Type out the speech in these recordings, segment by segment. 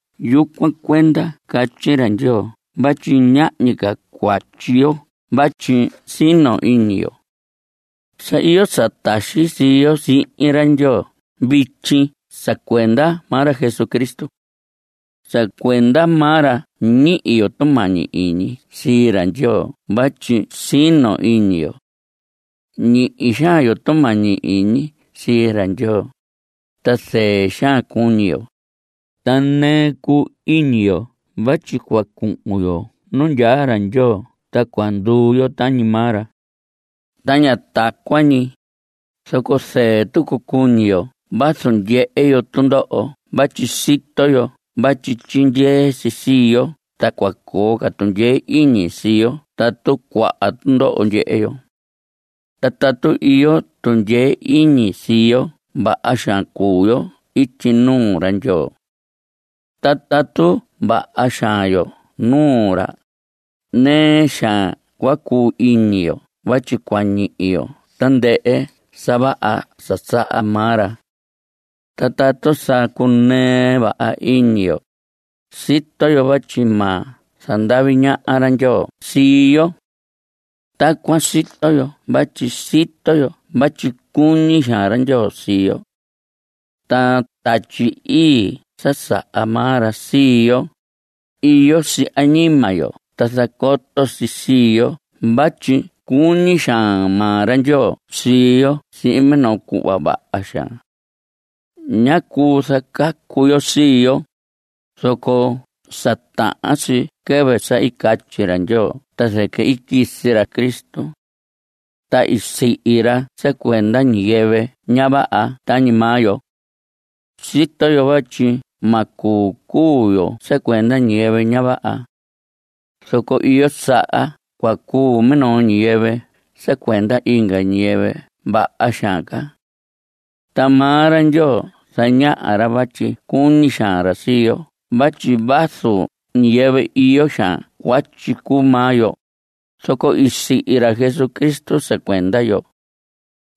Yucuan cuenda catyi ra Ndyoo vatyi ñahñi ca cuatyi yo vatyi sino iñi yo. Sa iyo sa taxi sii yo sihin ra Ndyoo vityi sa cuenda maa ra Jesucristo. Sa cuenda maa ra ñihi yo tumañi iñi sii ra Ndyoo vatyi sino iñi yo. Ñihi xaan yo tumañi iñi sii ra Ndyoo, ta zɨɨ xaan cuñi yo. Ta nɨɨ cuu iñi yo vatyi cua cuhun yo nu ndyaa ra Ndyoo ta cua nduu yo tañi maa ra. Ta ña tacuan ñi, zoco zɨɨ cuñi tucu yo vazu ndyehe yo tundoho vatyi sito yo vatyi tyindyee si sii yo ta cua coo ca tundyee iñi sii yo tatu cuaha tundoho ndyehe yo. Ta tatu iyo tundyee iñi sii yo vaha xaan cuu yo ityi nuu ra Ndyoo. Ta tatu vaha xaan yo nuu ra, nɨɨ xaan cua cuu iñi yo vatyi cua ñihi yo tandɨhɨ sa vaha sa saha maa ra. Ta tatu sa cunɨɨ vaha iñi yo, sito yo vatyi ma zandavi ñaha ra Ndyoo sii yo. Tacuan sito yo vatyi sito yo vatyi cuñi xaan ra Ndyoo sii yo. Ta Tatyi Ii sa saha maa ra sii yo, iyo si añima yo ta zacoto si sii yo vatyi cuñi xaan maa ra Ndyoo sii yo sihin minoo cuhva vaha xaan. Ñá cuu zacacu yo sii yo, zoco sa tahan si quɨvɨ sa i catyi ra Ndyoo ta zɨquɨ i quisi ra Cristo. Ta i sihi ra sa cuenda ñiyɨvɨ ña vaha tañi maa yo. Sito yo vatyi ma cuu cuu yo sa cuenda ñiyɨvɨ ña vaha. Zoco iyo saha cua cuu minoo ñiyɨvɨ sa cuenda inga ñiyɨvɨ vaha xaan ca. Ta maa ra Ndyoo zañaha ra vatyi cuñi xaan ra sii yo vatyi vazu ñiyɨvɨ iyo xaan cuatyi cuu maa yo, zoco i sihi ra Cristo sa cuenda yo.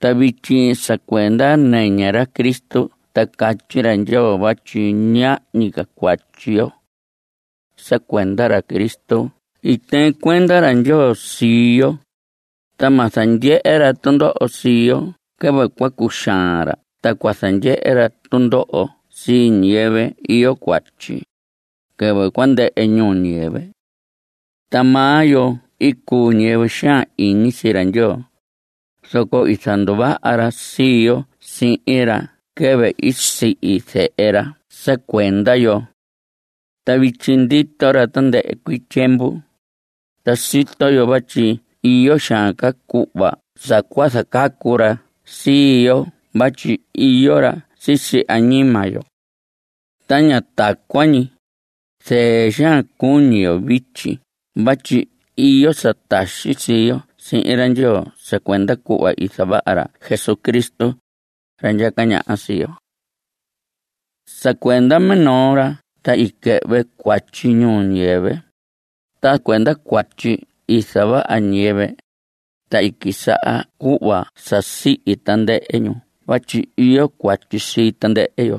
Ta vityi sa cuenda nɨñɨ ra Cristo ta catyi ra Ndyoo vatyi ñahñi ca cuatyi yo. Sa cuenda ra Cristo i tɨɨn cuenda ra Ndyoo sii yo, ta ma zandyehe ra tundoho sii yo quɨvɨ cua cuxaan ra ta cua zandyehe ra tundoho sii ñiyɨvɨ iyo cuatyi, quɨvɨ cua ndɨhɨ ñuu ñiyɨvɨ. Ta maa yo i cuu ñiyɨvɨ xaan iñi sii ra Ndyoo, zoco i zanduvaha ra sii yo sihin ra quɨvɨ i sihi Zehe ra sa cuenda yo. Ta vityi ndito ra tandɨhɨ cuii tyiemvu, ta sito yo vatyi iyo xaan ca cuhva sa cua zacacu ra sii yo vatyi iyo ra sisi añima yo. Ta ña tacuan ñi. Zɨɨ xaan cuñi yo vityi vatyi iyo sa taxi sii yo sihin ra Ndyoo sa cuenda cuhva i zavaha ra Jesucristo, ra ndyaca ñaha sii yo. Sa cuenda minoo ra ta i quɨhvɨ cuatyi ñuu ñiyɨvɨ. Ta cuenda cuatyi i zavaha ñiyɨvɨ, ta i quisaha cuhva sa sihi tandɨhɨ ñu vatyi iyo cuatyi sii tandɨhɨ yo.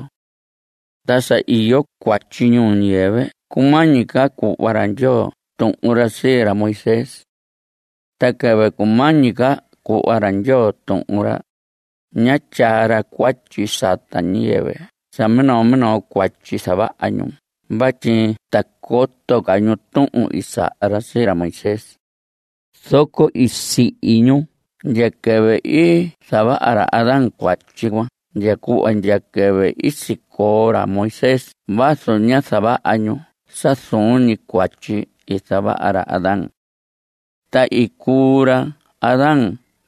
Ta sa iyo cuatyi ñuu ñiyɨvɨ cumañi ca cuhva ra Ndyoo tuhun ra sii ra Moisés. Ta quɨvɨ cumañi ca cuhva ra Ndyoo tuhun ra, ñá tyaa ra cuatyi sata ñiyɨvɨ sa minoo minoo cuatyi zavaha ñu vatyi ta coto ca ñu tuhun i saha ra sii ra Moisés. Zoco i sihi ñu ndya quɨvɨ i zavaha ra Adán cuatyi cuan ndya cuhva ndya quɨvɨ i sicoo ra Moisés vazu ñá zavaha ñu sa zuun ñi cuatyi i zavaha ra Adán. Ta i cuu ra Adán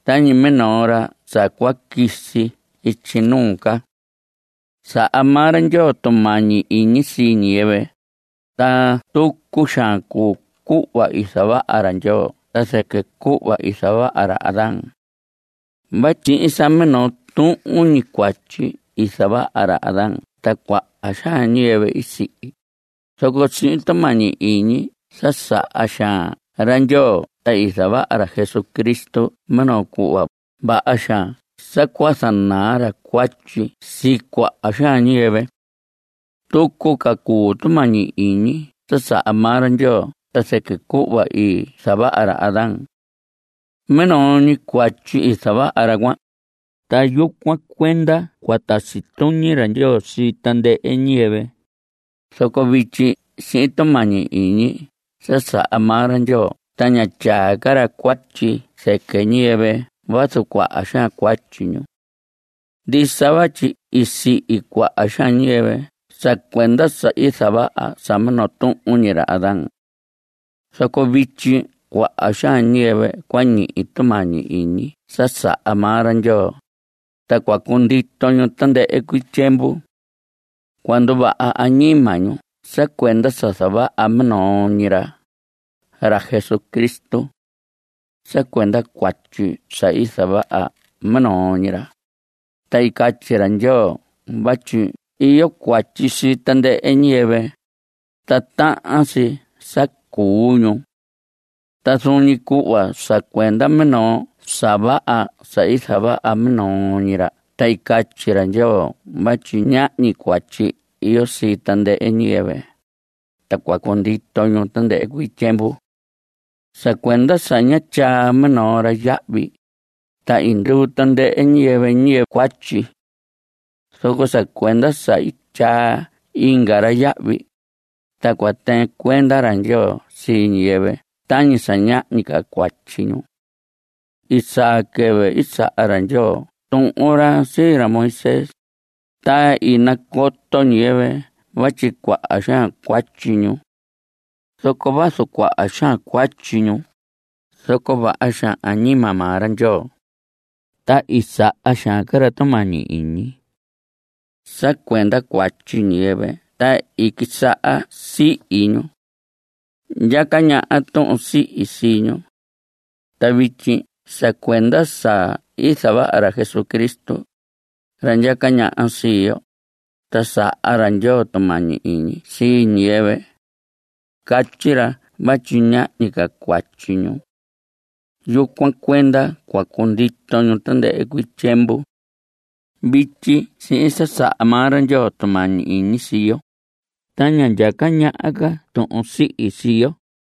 tañi minoo ra sa cua quisi ityi nuu ca. Saha maa ra Ndyoo tumañi iñi sii ñiyɨvɨ, ta tucu xaan cuu cuhva i zavaha ra Ndyoo ta zɨquɨ cuhva i zavaha ra Adán. Vatyi sihin sa minoo tuhun ñi cuatyi i zavaha ra Adán ta cuaha xaan ñiyɨvɨ i sihi, zoco sihin tumañi iñi sa saha xaan ra Ndyoo ta i zavaha ra Jesucristo minoo cuhva vaha xaan sa cua zanaa ra cuatyi sii cuaha xaan ñiyɨvɨ. Tucu ca cuu tumañi iñi sa saha maa ra Ndyoo ta zɨquɨ cuhva i zavaha ra Adán. Minoo ñi cuatyi i zavaha ra cuan, ta yucuan cuenda cua tasi tuñi ra Ndyoo sii tandɨhɨ ñiyɨvɨ. Zoco vityi sihin tumañi iñi sa saha maa ra Ndyoo ta ña tyaa ca ra cuatyi zɨquɨ ñiyɨvɨ vazu cuaha xaan cuatyi ñu. Ndisa vatyi i sihi cuaha xaan ñiyɨvɨ sa cuenda sa i zavaha sa minoo tuhun ñi ra Adán. Zoco vityi cuaha xaan ñiyɨvɨ cua ñihi tumañi iñi sa saha maa ra Ndyoo, ta cua cundito ñu tandɨhɨ cuii tyiemvu. Cua nduvaha añima ñu sa cuenda sa zavaha minoo ñi ra, ra Jesucristo. Sa cuenda cuatyi sa i zavaha minoo ñi ra, ta i catyi ra Ndyoo vatyi iyo cuatyi sii tandɨhɨ ñiyɨvɨ, ta tahan si sa cuu ñu. Ta zuun ñi cuhva sa cuenda minoo sa vaha sa i zavaha minoo ñi ra ta i catyi ra Ndyoo vatyi ñahñi cuatyi iyo sii tandɨhɨ ñiyɨvɨ, ta cua cundito ñu tandɨhɨ cuii tyiemvu. Sa cuenda sa ñá tyaa minoo ra yahvi, ta i nduu tandɨhɨ ñiyɨvɨ ñiyɨvɨ cuatyi. Zoco sa cuenda sa i tyaa inga ra yahvi, ta cua tɨɨn cuenda ra Ndyoo sii ñiyɨvɨ tañi sa ñahñi ca cuatyi ñu. I saa quɨvɨ i saha ra Ndyoo tuhun ra sii ra Moisés, ta i nacoto ñiyɨvɨ vatyi cuaha xaan cuatyi ñu. Zoco vazu cuaha xaan cuatyi ñu, zoco vaha xaan añima maa ra Ndyoo, ta i saha xaan ca ra tumañi iñi. Sa cuenda cuatyi ñiyɨvɨ ta i quisaha sihi ñu. Ndyaca ñaha tuhun sihi sii ñu. Ta vityi sa cuenda sa i zavaha ra Jesucristo, ra ndyaca ñaha sii yo, ta saha ra Ndyoo tumañi iñi sii ñiyɨvɨ. Catyi ra vatyi ñahñi ca cuatyi ñu. Yucuan cuenda cua cundito ñu tandɨhɨ cuii tyiemvu. Vityi sihin sa saha maa ra Ndyoo tumañi iñi sii yo, ta ña ndyaca ñaha ca tuhun sihi sii yo.